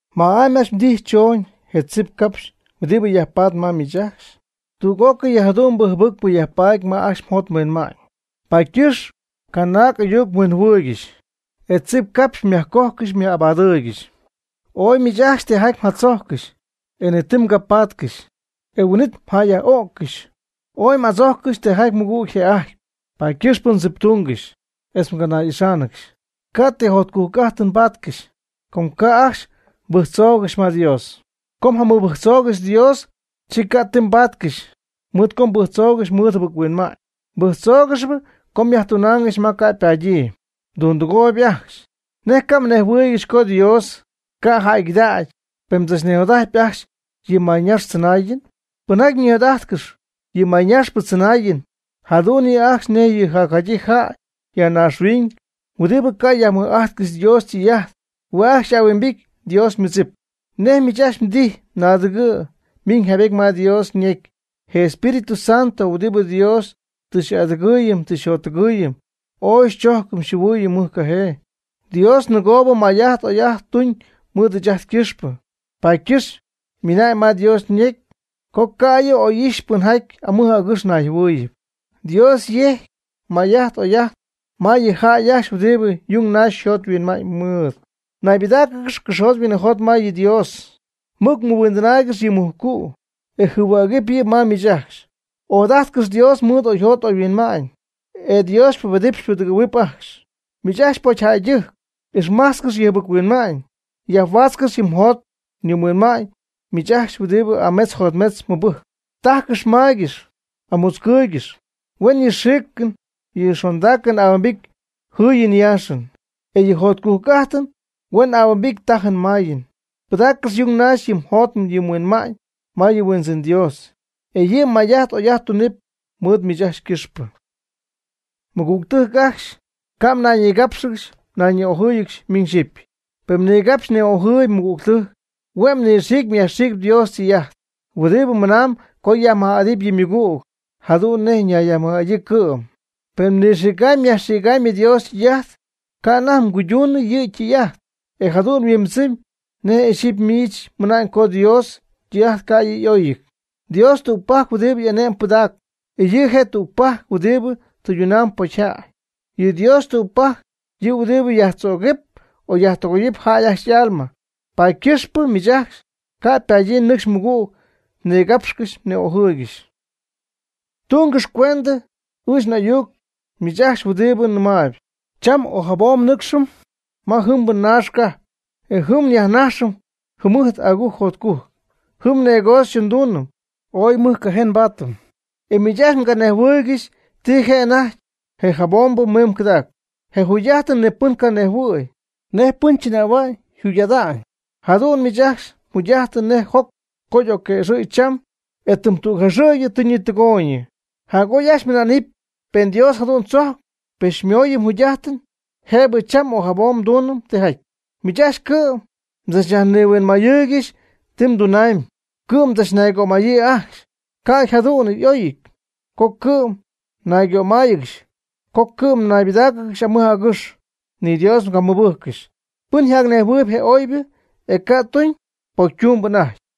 ¿Ma'amy ajcxy mdijy chooñ je tzip capx huɨdibɨ yajpatp ma miich ajcxy? Tüg'ócɨy yɨ jadu'mbɨ jɨbɨcpɨ yajpatp ma ajcxy mjot mhuinma'ñ, paady ycɨxp mganay'ayuc-huinjɨhuɨɨyɨgɨxy, e tzipcapxy myajcojcɨxy myaj'abadɨɨygɨxy. Ooy miich ajcxy tijaty mjatzojccɨxy, e ni ti mgapaatcɨxy, e huin'it mjäyyaj'öccɨxy. Ooy m'adzojccɨxy tijaty mɨgüg yjë'ajtyp, paady ycɨxpɨ mdziptungɨxy, etz mganay'ixáanɨgɨxy. Ca' ti jotcujc'ajtɨn mbaatcɨxy, com ca' ajcxy mbɨjctzoogɨxy ma Dios. Co mjamɨbɨjctzoogɨxy Dios, chi ca' ti mbaatcɨxy, mɨɨd co mbɨjctzoogɨxy mɨɨd jɨbɨc-huinma'ñ. Mbɨjctzoogɨxyp co myajtunaangɨxy ma ca' ypadyii. Mdundɨgooyb ajcxy. ¿Nej ca' mnejhuɨɨygɨxy co Dios ca' jäygɨdägy pen mdzachnijot'ajtyp ajcxy yɨ mayñax tzɨnaayɨn? Pɨnjaty nijot'ajtcɨxyp yɨ mayñaxpɨ tzɨnaayɨn, jadu'n yɨ' ajcxy nej yɨ jacjadyii jäy ya naaxhuiñ huɨdibɨ ca' yajmɨj'ajtcɨxy Dios ytɨy'ajt. Hue' je' ajcxy y'ahuimbity Dios ymɨdzip. Nej miich ajcxy mdijy, naadɨgɨ' ymiñ jaybety ma Dios yñecy: “Je Espíritu Santo huɨdibɨ Dios tɨ xy'adɨgɨɨyɨm tɨ xyjottɨgɨɨyɨm ooy xychojcɨm xyjɨhuɨɨyɨm mɨjcajee.” Dios ninɨgoobɨ may'ajt oy'ajt tuuñ mɨɨd ɨɨch ajt ycɨxpɨ, paady ycɨxpɨ ymɨna'ñ ma Dios ñecy co ca' yɨ' oy'ixy pɨnjaty amɨj agɨx nayjɨhuɨɨyɨp. Dios yejcpy may'ajt oy'ajt ma yɨ jäy ajcxy huɨdibɨ yung naxy jot huinma'ñ mɨɨdɨty. Naybɨdáacɨgɨx cɨxyjot huinɨjot ma yɨ Dios. Mɨc mɨhuindɨnaaygɨx yɨ mujcu', e jɨhuägɨpy yɨ' ma miich ajcxy. Ojadajtcɨx Dios mɨɨd oyjot oyhuinma'ñ, e Dios xypubedɨpy xypudɨgɨ̈huɨpy ajcxy. Miich ajcxy pocyjäydɨjc, ixmajtzcɨx yɨ jɨbɨc-huinma'ñ. Yajhuaatzcɨx yɨ mjot yɨ mhuinma'ñ miich ajcxy huɨdibɨ ametz jotmetz mɨbɨjcp. Tajcɨx maygɨx, amutzcɨɨygɨx. Huen yɨ mxiicɨn yɨ mxondaacɨn ahuimbity jɨɨyɨn yaaxɨn. E yɨ mjotcujc'ajtɨn huen ahuimbity tajɨɨ mayɨɨ. Pɨdaccɨx yung naxy yɨ mjot yɨ mhuinma'ñ ma yɨ mHuindzɨn Dios, e yɨ' may'ajt oy'ajt tunɨpy mɨɨd miich ajcxy ycɨxpɨ. Mɨgügtɨjc ajcxy, ca' mnayñigápxɨgɨxy mnayñi'ojɨ́ɨyɨgɨxy miñ xyɨpy. Pen mnigapxyp mni'ojɨɨyb mmɨgügtɨjc, hue' mnɨxiicpy myajxiicpy Dios ytɨy'ajt huɨdibɨ mɨnaamb co myajmɨj'adɨpy yɨ mmɨgüg jadu'n nej mnayyajmɨj'adyii cɨ'm. Pen mnɨxïgamyb myajxïgamyb Dios ytɨy'ajt, ca' anajty mguyduñ yɨ tɨy'ajt, e jadu'n yhuimbɨdzɨmyb nej ixyipy miich mɨna'ñ co Dios ytɨy'ajt ca' yɨ' y'oyɨty. Dios tügpajc huɨdibɨ ane'mɨn pɨdägy, e yɨ' je' tügpajc huɨdibɨ tɨydunamb pocyjäy. Yɨ Dios tügpajc huɨdibɨ yajtzögɨp o yajtɨgoyɨp jäy ajcxy y'alma. Paady ycɨxpɨ miich ajcxy ca' ypadyii nɨcxy mɨgüg mnigapxcɨxy mni'ojɨɨygɨxy. Tungɨx cuendɨ ɨɨch n'ayuc miich ajcxy huɨdibɨ mɨnamb: “Cham o jabom nnɨcxɨm ma yɨjɨmbɨ naax cajp, e jɨm nyajnajxɨm jɨmɨjt agujc jotcujc, jɨm negocio nduunɨm, ooy mɨjcajee nbaatɨm.” E miich ajcxy ni mganejhuɨɨygɨxy ti je' anajty je jabombɨ mimb cɨdacp. Je jugy'ajtɨn ni pɨn ca' nejhuɨ̈y nej pɨn chɨnähua'ñ yjugy'ada'ñ. Jadu'n miich ajcxy mjugy'ajtɨn nej joc co y'ocquëxɨ̈gy cham, e tɨm tügjaxɨ̈gy tɨ ñitɨgooyñɨ. Jac'oy ajcxy mmɨna'nɨp: “Pen Dios jadu'n tzojp, pen xymooyɨm jugy'ajtɨn, jëbɨ cham o jabom nduunɨm tijaty.” Miich ajcxy cɨ'm mdzachyajnihuinmaaygɨxy ti mdunamyb, cɨ'm mdzachnaygömayyii ajcxy. Ca' jadu'n y'oyɨty co cɨ'm mnaygömáayɨgɨxy; co cɨ'm mnaybɨdáacɨgɨxy amɨj agɨx, ni Dios mgamɨbɨjccɨxy. Pɨn janejhuɨɨyb je oybɨ, e ca' tuñ, pocytumb anajty.